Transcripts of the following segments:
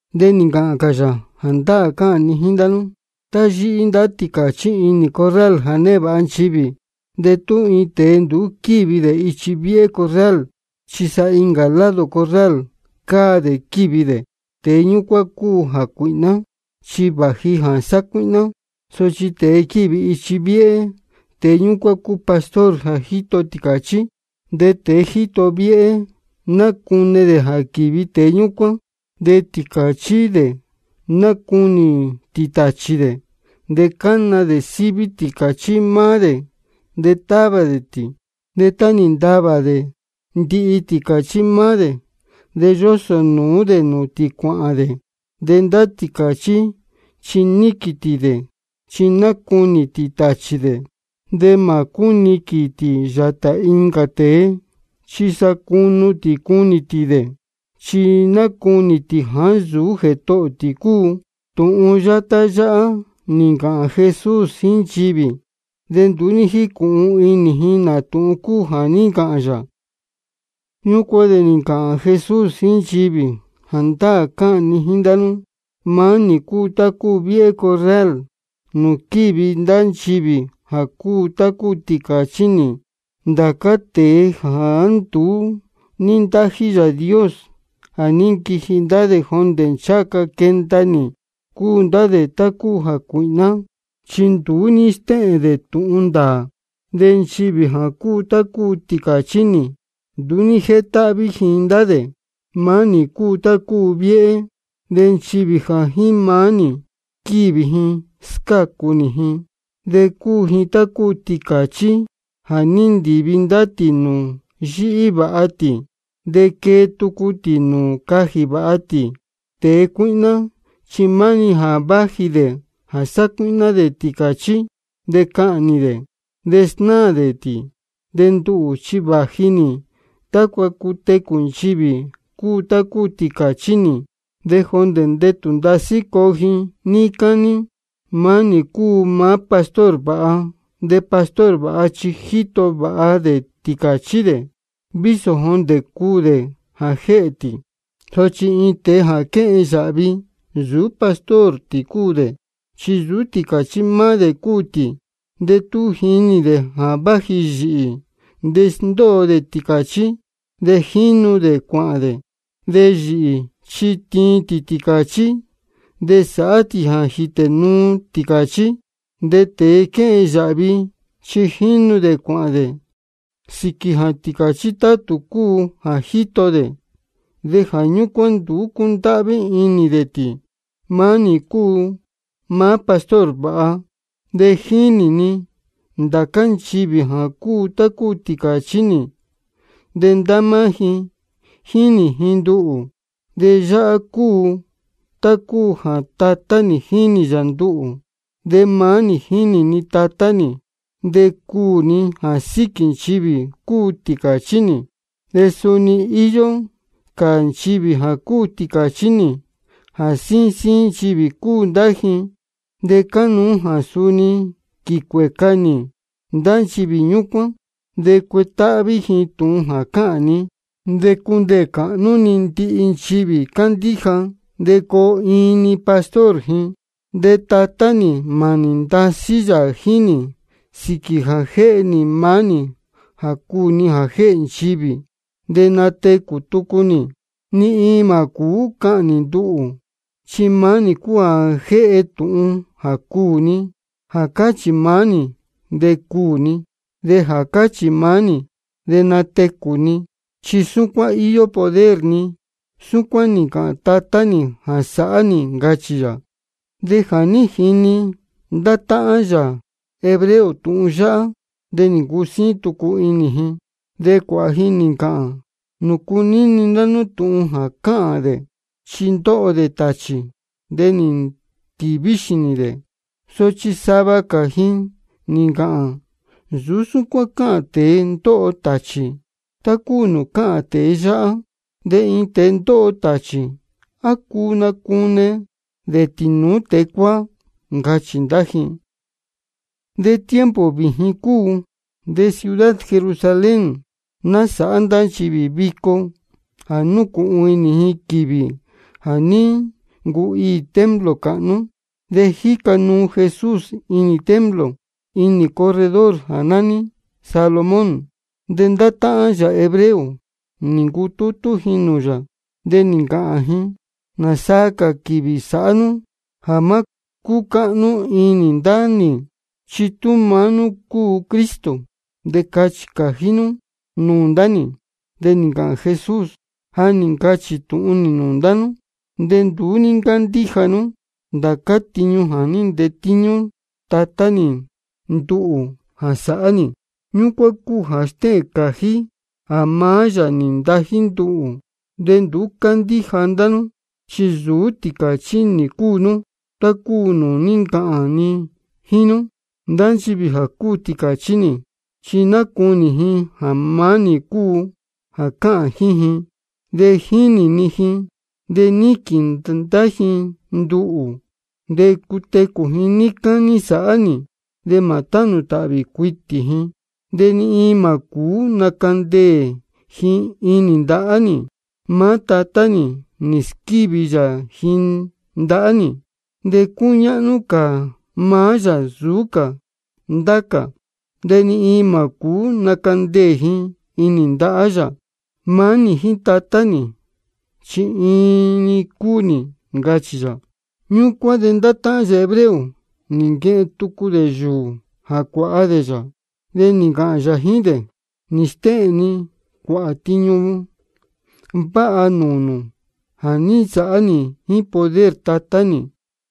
De nī ncāhān cā yā: Jāndáā cáhān ni jíín ndá nú, tá yíhí ndá tīcāchí inī corral jā névāha cáhnú nchivī, de tú iin tēe nduú quívi dē ichi viéhé corral, chi sa incā lado corral cáa dē quívi dē, tēe ñúcuán cúu jācuīhná, chi vāji jā sacuíhná. Sochi tēe quívi ichi viéhé, tēe ñúcuán cúu pastor jā jíto tīcāchí. De tēe jíto viéhé, nácune dē jā quīvi tēe ñúcuán. De tīcāchí dē nácunī tī tāchī dē. De cána dē síví tīcāchí maá dē, de távā dē tī. De tá nī ntavā dē ndihi tīcāchí maá dē, de yósō nūú dē nūū tī cuāhān dē. De ndá tīcāchí chi níquīn tī dē, chi nácunī tī tāchī dē. De mā cúniquīn tī yātā incā tēe, chi sa cunu tī cunī tī dē, chi nácunī tī jāá nsūú jētohō tī cúu. Tūhun yátá yáhá nī ncāhān Jesús jíín nchivī, de nduú ní jícūhun inī ji nā tūhun cúu jā ní ncāhān yā. Ñúcuán de nī ncāhān cā Jesús jíín nchivī: Jāndáā cáhān ni jíín ndá nú: Maá nī cúu tá cúu viéhé corral nūū quívi ndá nchivī jā cúu tá cúu tīcāchí nī. Ndācá tēe jāá nduú ní ntájí Yāā Dios, jā ní nquiji ndá dē jondē ncháha ca quenda nī, cúu ndá dē tá cúu jācuīhná, chi nduú ní stéhēn dē tūhun ndāā. De nchivī jā cúu tá cúu tīcāchí nī, nduú ní jétáhví ji ndá dē. Maá nī cúu tá cúu viéhé. De nchivī jā jíín maá nī quívi ji, scácu nī ji. De cúu ji tá cúu tīcāchí jā ndívi ndá tī nūū yíhí vāha tī, de quée tucu tī nūū cajī vāha tī. Tēe cuíhná chi maá-ni jā váji dē jā sacuíhná dē tīcāchí, de cahnī dē, de snáā dē tī. De nduhū chi vāji nī tácua cutecū nchivī cúu tá cúu tīcāchí nī, de jondē ndetū ndasí coo ji níí cání. Maá nī cúu maá pastor vāha. De pastor vāha chi jíto vāha dē tīcāchí dē, vísō jondē cuū dē jā jéhē tī. Sochi iin tēe jā quéhen yāhvi, nsūú pastor tī cúu dē, chi nsūú tīcāchí maá dē cúu tī. De tú jínī dē jā váji yīhī, de sndóo dē tīcāchí, de jínu dē cuāhān dē. De yīhī chi tíin tī tīcāchí, de sáhá tī jā jítē nuu tīcāchí. De tēe quéhen yāhvi chi jínu dē cuāhān dē sīquī jā tīcāchí tátū cúu jā jíto dē, de jā ñúcuán nduú cúndáhví inī dē tī. Maá nī cúu maá pastor vāha. De jínī ni ndācá nchivī jā cúu tá cúu tīcāchí nī, de ndá máá ji jínī ji nduhū. De yáhá cúu tá cúu jā Tatá nī jínī yā nduhū, de maá nī jínī ni Tatá nī. De cuū ni jā síquī nchivī cúu tīcāchí nī. De suni íyó cā nchivī cúu tīcāchí nī, de síín síín nchivī cúu ndá ji. De cánuú jā suni quīcuēca nī ndá nchivī ñúcuán. De cuetáhví ji tūhun jā cáhān ni. De cundeē cāhnú-ni ndihi nchivī cándíja, de coo iin-ni pastor ji. De Tatá nī mānī ndasí yā jíín nī sīquī jā jéhe nī maá nī jā cuū ni jā jéhē nchivī, de natecū tucu nī. Ni iin mā cūú cahnī nduhū, chi maá nī cúu jā jéhe tūhun jā cuū ni. Jā cáchī maá nī de cuū ni, de jā cáchī maá nī de natecū ni, chi súcuán íyó poder ni. Súcuán nī ncāhān Tatá nī jā sāhá nī, ncachī yā. De jā ní jini ndá táhán yā hebreo tūhun yáhá, de nī ncusíín tucu inī ji. De cuāhā ji nī ncāhān: ¿Nūcu níni ndá nú tūhun jā cáhān dē? Chi ndóho dē tāchī, de nī ntīví xīnī dē. Sochi sava gā ji nī ncāhān: Nsūú súcuán cáhān tēe ndóho tāchī, tá cúu nūū cáhān tēe yáhá. De iin tēe ndóho tāchī, ¿á cuu nacune dē tīnūú tēe cuáá? ncachī ndá ji. De tiempo vījin cúu, de ciudad Jerusalén násāhá ndá nchivī vico jā núcūhun inī ji quīvī jā ní ncuhiī templo cāhnú. De jíca nuu Jesús inī templo, inī corredor jā nání Salomón. De ndá táhán yā hebreo nī ncutútú ji nūū yā, de nī ncāhān ji: ¿Nāsaa cā quīvī sāhá nú jā má cúcáhnú inī ndá nī? Chi tú maá nú cúu Cristo, de cachī cājí nú nūū ndá nī. De nī ncāhān Jesús: Ja nī ncachī tūhun nī nūū ndá nú, de nduú ní ncándíja nú. Ndācá tiñu jā ní ntetíñú Tatá nī nduhū jā sāhá nī, ñúcuán cúu jā stéhēn cājí jā maá yā nī ntají nduhū. De nduú cándíja ndá nú, chi nsūú tīcāchí nī cúu nú, tá cúu nūū ní ncāhān ni jíín nú. Ndá nchivī jā cúu tīcāchí nī, chi nácunī ji jā maá nī cúu jā cáhān jíín ji. De jínī ni ji, de níquīn ndá ji nduhū. De cutecū ji níí cání sāhá nī, de mā tánū tāhvī cuitī ji. De ni iin mā cūú nacandeē ji inī ndahá nī. Maá Tatá nī nī squívi yā ji ndahá nī. De cúñáhnú cā maá yā nsūú cā ndācá cā. De ni iin mā cūú nacandeē ji inī ndahá yā. Maá nī jíín Tatá nī, chi iin-ni cúu nī, ncachī yā. Ñúcuán de ndá táhán yā hebreo nī nquehen tucu dē yūū jā cuāha dē yā. De nī ncāhān yā jíín dē: Nī stéhēn ni cuāhā tiñu váha nūū nū jā ní nsāhá nī jíín poder Tatá nī.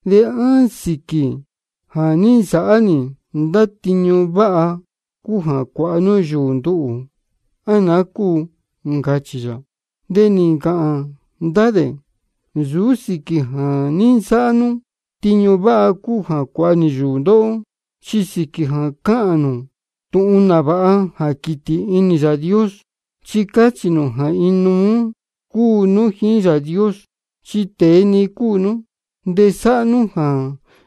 ¿De á sīquī jā ní nsāhá nī ndá tiñu váha cúu jā cuāha nú yūū nduhū, á naá cúu? ncachī yā. De nī ncāhān ndá dē: Nsūú sīquī jā ní nsāhá nú tiñu váha cúu jā cuāha nī yūū ndóhó, chi sīquī jā cáhān nū tūhun nāvāha jā quītī inī Yāā Dios, chi cáchī nū jā inuú cúu nú jíín Yāā Dios. Chi tēe-ni cúu nú, de sáhá nú jā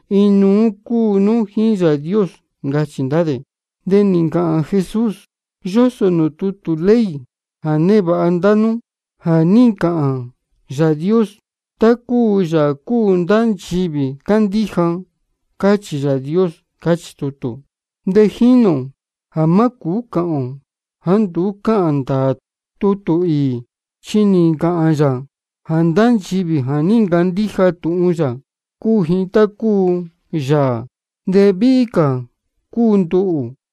inuú cúu nú jíín Yāā Dios, ncachī ndá dē. De nī ncāhān Jesús: Yósō nūū tutū ley jā névāha ndá nú jā ní ncāhān Yāā Dios: Tá cúu yāā cúu ndá nchivī cándíja, cáchī Yāā Dios, cáchī tutū. De jínī ō jā má cūú cāhān ō jāá nduú cáhān ndāā tutū īī. Chi nī ncāhān yā jā ndá nchivī jā ní ncandíja tūhun yā, cúu ji tá cúu yāā. De víhí cā cúu nduhū.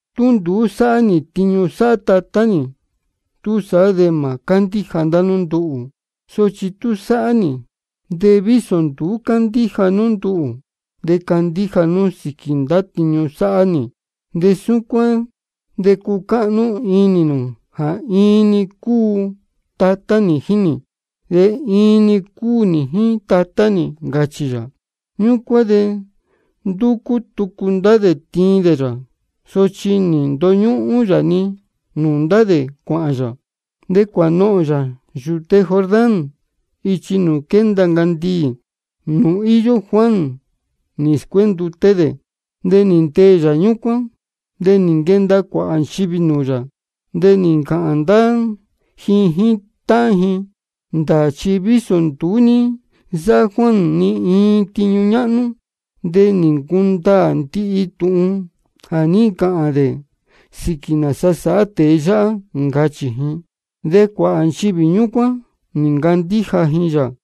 Tú nduú sáhá nī tiñu sáhá Tatá nī, túsaá de mā cándíja ndá nú nduhū. Sochi tú sáhá nī, de vísō nduú cándíja nú nduhū, de candíja nú sīquī ndá tiñu sáhá nī. De súcuán de cucáhnú inī nū jā iin-ni cúu Tatá nī jíín nī, de iin-ni cúu nī jíín Tatá nī, ncachī yā. Ñúcuán de ndúcú tucu ndá dē tiin dē yā. Sochi nī ndoñúhún yā-ni nūū ndá dē cuāhān yā. De cuānohōn yā yūte Jordán ichi nūū quénda ncandiī, nūū ní īyo Juan nī scuénduté dē. De nī ndeē yā ñúcuán. De nī nquenda cuāhā nchivī nūū yā, de nī ncāhān ndá ji jíín táhán ji: Ndāā chi vísō nduú ní nsáhá Juan ni iin tiñu ñáhnú, de nī ncundaā ndihi tūhun jā ní ncāhān dē sīquī nāsa sáhá tēe yáhá, ncachī ji. De cuāhā nchivī ñúcuán nī ncandíja ji yā.